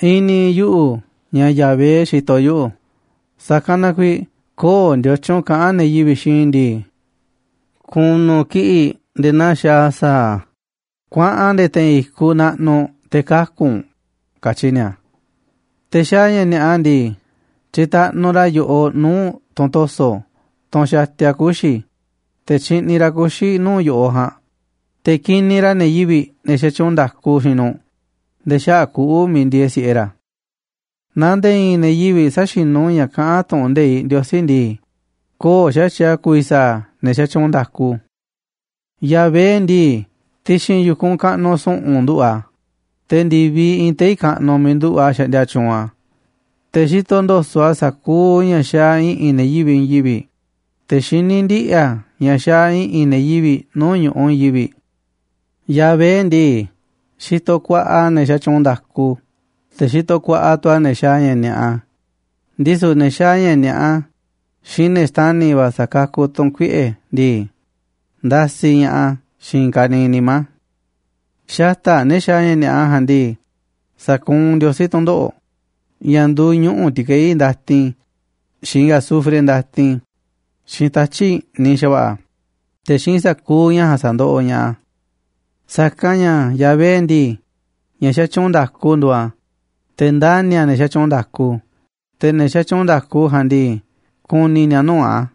I̱ni̱ yuꞌu̱ ña̱ Yahvé xitoꞌ yuꞌu̱, sa̱kanꞌ na kuiiꞌ köo̱ꞌ ndiotyun kaꞌán ne̱ yivi̱ꞌ xiinꞌ i̱ ndii: “Ku̱nu̱ kiꞌi̱ꞌ nde̱e̱ naa xaaꞌ sa̱a̱, kuaꞌan nde̱e̱ te̱i̱n i̱kuꞌ naꞌnuꞌ te̱ kaku̱ u̱nꞌ”, katyi ni̱a̱. Te̱ xaaꞌ ña̱ ni̱a̱ꞌa ndii, tyitaꞌnuꞌ ra̱ yo̱ꞌoꞌ nuu̱ꞌ tunꞌ to̱so̱, tunꞌ xatia kuxi̱, te̱ tyiꞌniꞌ ra̱ kuxi̱ nuu̱ꞌ yo̱ꞌoꞌ ja̱a̱nꞌ, te̱ kiniꞌ ra̱ ne̱ yivi̱ꞌ, ne̱ xatyuunꞌ nda̱ku xiinꞌ nu̱ꞌ nde̱e̱ xaꞌa̱ꞌ kuꞌu̱ miiꞌ ndieeꞌ si̱ꞌe ra̱. Naaꞌ nde̱e̱ i̱i̱n ne̱ yivi̱ꞌ säxinú ka̱ ña̱ kaꞌán tu̱ꞌu̱n nde̱iꞌ Ndiosí ndii, köo̱ꞌ xa̱tyiꞌ a̱ ku̱vi̱ sa̱a̱ ne̱ xatyuunꞌ nda̱ku. Yahvé ndii, ti̱xi̱n yu̱kunꞌ kaꞌnuꞌ su̱ꞌu̱n nduꞌu̱ꞌ a̱, te̱ ndi̱viꞌ iinꞌ tei̱ kaꞌnuꞌ miiꞌ nduꞌu̱ꞌ a̱ xaꞌndia tyuunꞌ a̱. Te̱ xitoꞌ ndo̱so̱ꞌ a̱ sa̱kuuꞌ ña̱ xaaꞌ i̱ꞌi̱n ne̱ yivi̱ꞌ i̱i̱n yivi̱ꞌ, te̱ xiní ndiꞌi̱ a̱ ña̱ xaaꞌ i̱ꞌi̱n ne̱ yivi̱ꞌ nuu̱ꞌ ñu̱ꞌuꞌ i̱i̱n yivi̱ꞌ. Yahvé ndii, xitoꞌ kuaꞌa a̱ ne̱ xatyuunꞌ nda̱ku, te̱ xitoꞌ kuaꞌa tu̱ a̱ ne̱ xaaꞌ ña̱ ni̱a̱ꞌa, ndisu̱ ne̱ xaaꞌ ña̱ ni̱a̱ꞌa xiinꞌ ne̱ xtani̱ va̱ sa̱kakuꞌ tu̱n kuiꞌe̱ ndii, ndasiꞌ ña̱ꞌaꞌ a̱ xiinꞌ i̱i̱n ka̱niiꞌ nimá a̱. Xata̱ꞌ ne̱ xaaꞌ ña̱ ni̱a̱ꞌa ja̱a̱nꞌ ndii, sa̱kuunꞌ Ndiosí tu̱ndoꞌo̱ꞌ, ña̱ nduuꞌ ñuꞌu̱ ti̱keí ndatin, xiinꞌ azufre ndatin, xiinꞌ tatyi̱ꞌ i̱ꞌniꞌ xa̱va̱ꞌa̱, te̱ xiinꞌ sa̱kuuꞌ ña̱ ja̱a̱nꞌ sa̱ndoꞌoꞌ ña̱ꞌaꞌ a̱. Sa̱kanꞌ ña̱ Yahvé ndii, ña̱ xatyuunꞌ nda̱ku nduuꞌ a̱, te̱ ndani̱ a̱ ne̱ xatyuunꞌ nda̱ku. Te̱ ne̱ xatyuunꞌ nda̱ku ja̱a̱nꞌ ndii, ku̱ni̱ ni̱a̱ nuu̱ꞌ a̱.